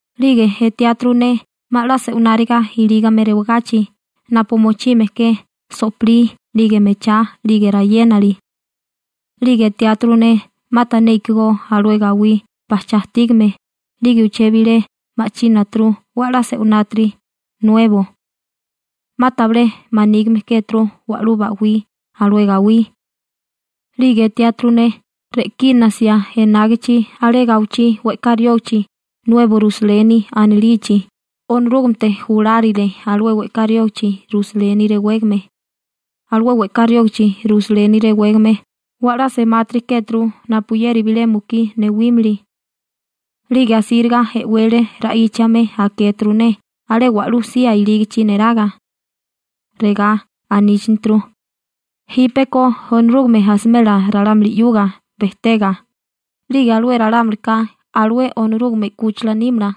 'Lige etiáturu ne 'ma 'la se'wináriga ilígame rewagachi napu mochime ke so'pilí 'lige mechá 'lige rayénali. 'Lige etiáturu ne 'ma tané ikigó alué gawí bajchá ajtígame 'lige uché bilé ma'chínaturu 'we 'la se'winátiri, nuebo. 'Ma tabilé manígime kéturu wa'lú ba'wí alué gawí. 'Lige etiáturu ne re'kínasia enágichi alé gawichí we'ká riógichi Nuebo Rusaleni anilichi, Onorúgamete julárile alué we'ká riógichi Rusaleni rewégame. Alué we'ká riógichi Rusaleni rewégame 'we 'la semátiri kéturu napuyeri bilé mukí newímili. 'Lige asíriga e'wele ra'íchame akéturu ne alé wa'lú sía ilígichi neraga. Regá aníchaneturu: ―Jípeko Onorúgame asimela ralámuli 'yuga bejtega, 'lige alué ralámulika alué Onorúgame 'kúchila nímala.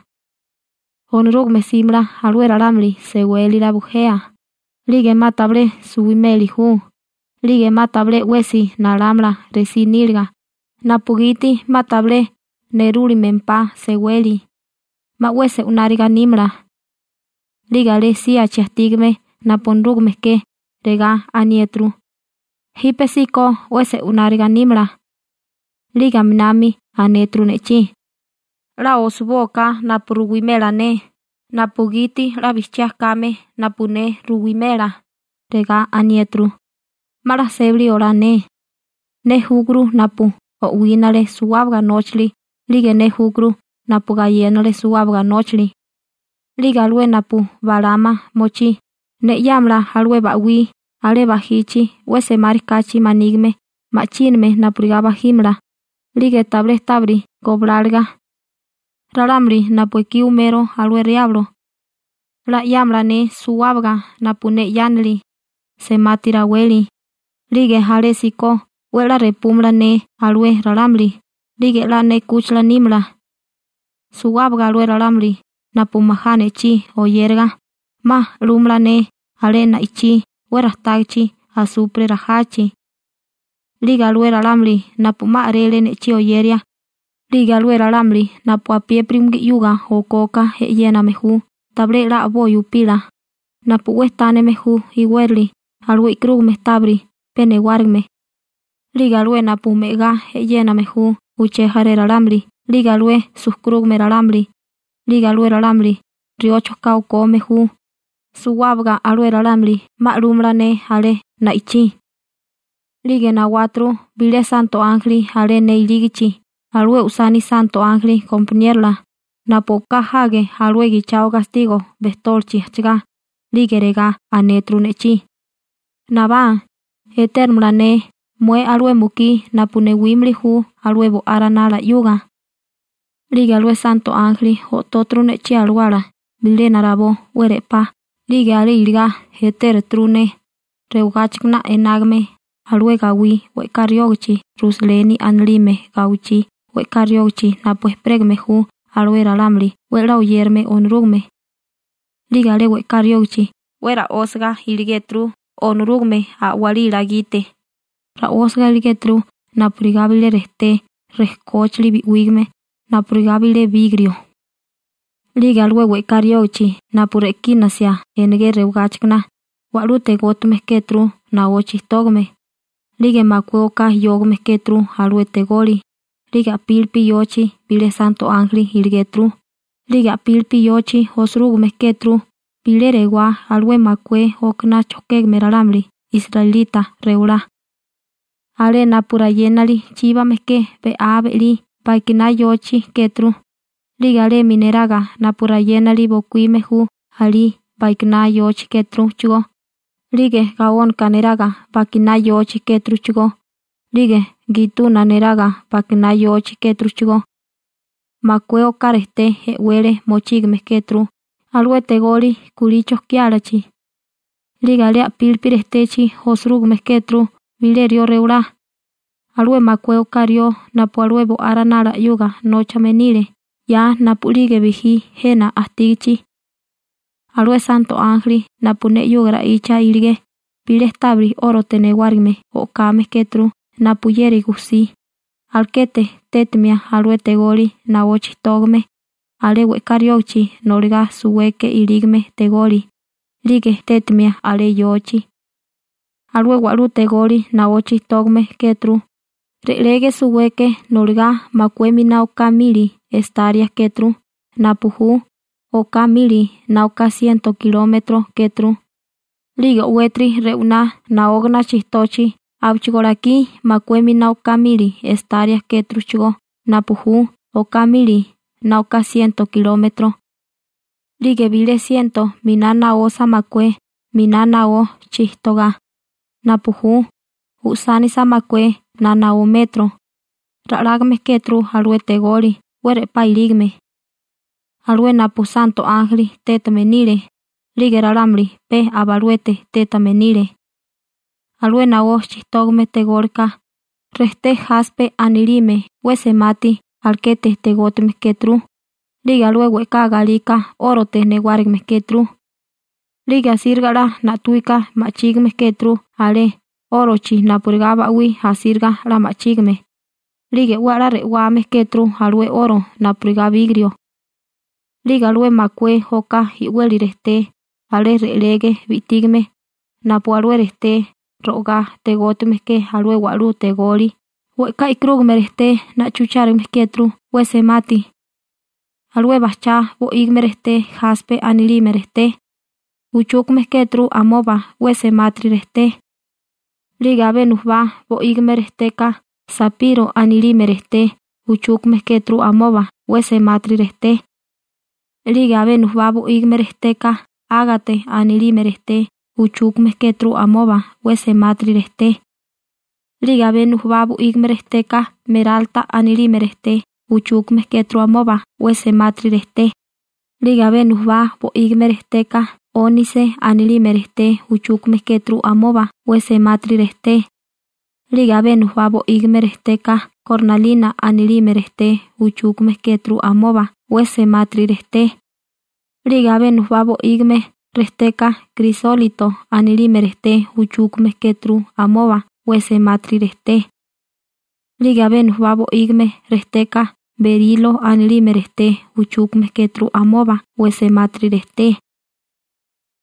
Onorúgame 'símala alué ralámuli sewélila bujea, 'lige 'ma tabilé suwimeli ju, 'lige 'ma tabilé 'wesi nalámala resí níliga, napugiti 'ma tabilé nerúlimempá seweli, 'ma 'we se'wináriga nímala. 'Lige alé síachi ajtígame napu Onorúgame ke, regá aniéturu: ―Jípesíko 'we se'wináriga nímala. 'Lige aminami anéturu ne'chí: ―'La osibóaká napu ruwimela ne napugiti 'la bijchiá kame napu ne ruwimela. 'Lige regá aniéturu: ―'Ma 'la sébali olá ne. Ne júkuru napu o'wínale suwábaga nóchali 'lige ne júkuru napu gayénale suwábaga nóchali. 'Lige alué napu balama mochí, ne 'yámala alué ba'wí alé bajichi 'we semárikáchi manígime ma'chíname napurigá bajímala, 'lige tabilé tábiri gobláliga. Ralámuli napu ekí umero alué Riablo, 'la 'yámala ne suwábaga napu ne 'yánili: semati raweli, 'lige alésíko 'we 'la repúmala ne alué ralámuli, 'lige 'la ne 'kúchila nímala. Suwábaga alué ralámuli napu majá ne'chí oyéraga, 'ma 'lúmala ne alé na'ichí 'we rajtágichi asupre rajachi. 'Lige alué ralámuli napu 'ma a'rele ne'chí oyeria, 'lige alué ralámuli napu apiépiri umugí 'yuga okoka e'yéname ju tabilé 'la a'boi upila, napu 'we tánime ju iwérali alué e'karúgame tábiri pe newárigime, 'lige alué napu me'agá e'yéname ju uché jaré ralámuli, 'lige alué sujkurúgame ralámuli, 'lige alué ralámuli riocho ka okome ju, suwábaga alué ralámuli 'ma 'lúmala ne alé na'ichí. 'Lige nawáturu bilé santo ánjeli alé ne ilígichi alué usani santo ánjeli gompaniérola, napu o'ká jage alué gichao gastigo bejtólichi ajchagá, 'lige regá anéturu ne'chí: ―Nabá, etéramala ne mué alué mukí napu newímili ju alué Bo'á Ranala 'yuga. 'Lige alué santo ánjeli o'tóturu ne'chí alawala bilena rabó 'we re'pá, 'lige alé iligá etéruturu ne rewagáchikana enágame alué gawí we'ká riógachi Rusaleni anilime gawichí we'ká riógichi napu ejperégame ju alué ralámuli 'we 'la oyérame Onorúgame. 'Lige alé we'ká riógichi 'we ra'ósiga iligéturu Onorúgame a'walila gite. Ra'ósaga iligéturu napurigá bilé rejté rekóchili bi'wígame napurigá bilé bigrio. 'Lige alué we'ká riógichi napu re'kínasia enegé rewagáchikana, wa'lú tegótigame kéturu naó chijtógame, 'lige makué oká yógame kéturu alué tegoli, 'lige a'pílipi yochi bilé santo ánjeli iligéturu. 'Lige a'pílipi yochi osirúgime kéturu bilé rewá alué makué okaná chojkégame ralámuli israelita rewalá. Alé napu rayénali chíbame ke be'á be'lí bakiná yochi kéturu, 'lige alemi neraga napu rayénali bokuíme ju alí bakiná yochi kéturuchigó, 'lige gaónaka neraga bakiná yochi kéturuchigó, 'lige gituna neraga bakiná yochi kéturuchigó. Makué oká rejté e'wele mochígame kéturu alué tegoli kulí chojkiálachi. 'Lige alé a'pílipi rejtechi osirúgime kéturu bilé rió rewalá, alué makué oká rió napu alué Bo'á Ranala 'yuga nóchame nile 'ya napu'lige bijí jena ajtígichi. Alué santo ánjeli napu ne 'yuga ra'icha iligé bilé tábiri 'órote newárigime o'kame kéturu napuyeri gujsí, alekete tétimia alué tegoli naó chijtógame alé we'ká riógachi noligá suweke ilígame tegoli, 'lige tétimia alé yochi. Alué wa'lú tegoli naó chijtógame kéturu, re'lege suweke noligá makué miná oká mili estaria kéturu (napu ju oká mili na oká siento kilómetro kéturu), 'lige o'wétiri rewiná naógana chijtochi abechigó lakí makué miná oká mili estaria kéturuchigó (napu ju oká mili na oká siento kilómetro). 'Lige bilé siento miná naosa makué miná naó chitogá (napu ju usánisa makué na naó metro) ra'lágame kéturu alué tegoli 'we re'pá ilígame. Alué napu santo ánjeli tétame nile 'lige ralámuli pe aba aluete tétame nile. Alué naó chijtógame tególika, rejté jaspe anilime 'we semati alekete tegótigame kéturu, 'lige alué we'ká galika 'órote newárigime kéturu. 'Lige asíriga 'la na'tawika ma'chígime kéturu alé 'órochi napurigá ba'wí asíriga 'la ma'chígime, 'lige 'we 'la re'wame kéturu alué 'oro napurigá bigrio. 'Lige alué makué oká i'weli rejté alé re'lege bi'tígame napu alué rejté ro'agá tegótigame ke alué wa'lú tegoli we'ká e'karúgame rejté na'chuchárigame kéturu 'we semati. Alué bajchá bo'ígime rejté jaspe anilime rejté uchúkame kéturu amoba 'we semátiri rejté. 'Lige abé nujubá bo'ígime rejteka sapiro anilime rejté uchúkame kéturu amoba 'we semátiri rejté. 'Lige abé nujubá bo'ígime rejteka ágate anilime rejté uchúkame kéturu amoba 'we semátiri rejté, 'lige abé nujubá bo'ígime rejteka meralta anilime rejté uchúkame kéturu amoba 'we semátiri rejté. 'Lige abé nujubá bo'ígime rejteka 'ónise anilime rejté uchúkame kéturu amoba 'we semátiri rejté, 'lige abé nujubá bo'ígime rejteka kornalina anilime rejté uchúkame kéturu amoba 'we semátiri rejté, 'lige abé nujubá bo'ígime rejteka krisólito anilime rejté uchúkame kéturu amoba 'we semátiri rejté, 'lige abé nujubá bo'ígime rejteka berilo anilime rejté uchúkame kéturu amoba 'we semátiri rejté,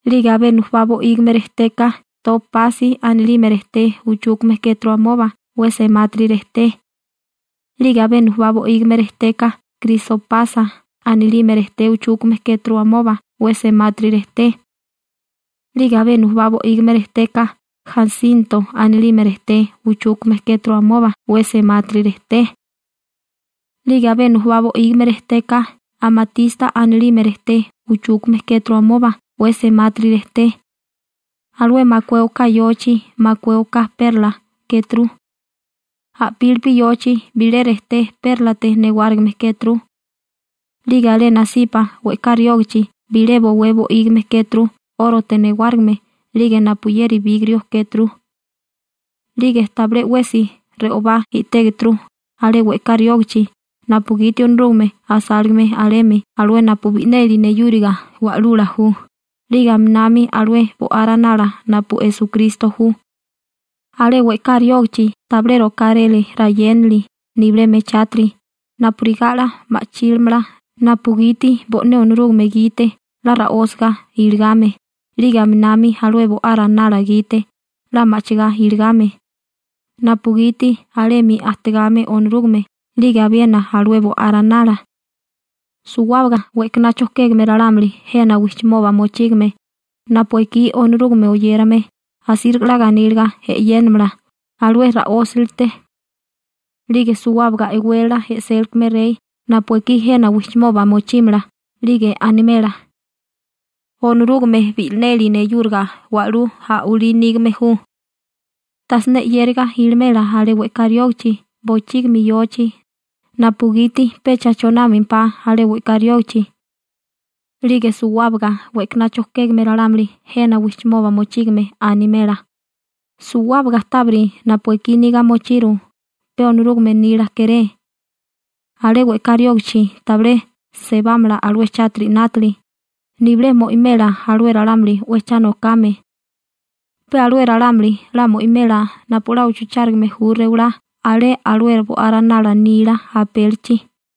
'lige abé nujubá bo'ígime rejteka topasi anilime rejté uchúkame kéturu amoba 'we semátiri rejté, 'lige abé nujubá bo'ígime rejteka krisopasa anilime rejté uchúkame kéturu amoba 'we semátiri rejté, 'lige abé nujubá bo'ígime rejteka jasinto anilime rejté uchúkame kéturu amoba 'we semátiri rejté, 'lige abé nujubá bo'ígime rejteka amatista anilime rejté uchúkame kéturu amoba 'we semátiri rejté. Alué makué oká yochi makué oká perla kéturu. A'pílipi yochi bilé rejté pérlate newárigime kéturu. 'Lige alé nasipa we'ká riógichi bilé bowé bo'ígime kéturu 'órote newárigime 'lige napuyeri bigrio kéturu. 'Lige tabilé 'wesi re'obá i'tégeturu alé we'ká riógichi, napugiti Onorúgame asáligame alemi alué napu bi'neli neyúriga wa'lula ju, 'lige aminami alué Bo'á Ranala napu Esukristo ju. Alé we'ká riógachi tabilé rokáré rayénali nibilé mechátiri napurigá 'la ma'chílamala napugiti bo'né Onorúgame gite 'la ra'ósiga iligame, 'lige aminami alué Bo'á Ranala gite 'la ma'chigá iligame, napugiti alemi ajtigame Onorúgame 'lige abiena alué Bo'á Ranala. Suwábaga we'kaná chojkégame ralámuli jena wijchimoba mochígame napu ekí Onorúgame oyérame asíriga 'la ganíliga e'yénamala alué ra'ósilite. 'Lige suwábaga e'wélala e'sélikame rey napu ekí jena wijchimoba mochímala 'lige animela: ―Onorúgame bi'neli neyúriga wa'lú a'walí nígame ju. Tajsiné 'yériga ilimela alé we'ká riógichi bochígimi yochi, napugiti pecha chonámempá alé we'ká riógichi. 'Lige suwábaga we'kaná chojkégame ralámuli jena wijchimoba mochígame animela: ―Suwábaga tábiri napu ekí niga mochiru, pe Onorúgame nila kéré. Alé we'ká riógichi tabilé sebámala alué chátiri 'nátili, nibilé mo'imela alué ralámuli 'we cha nokame. Pe alué ralámuli 'la mo'imela napu 'la uchuchárigame ju rewalá alé alué Bo'á Ranala nila apélichi.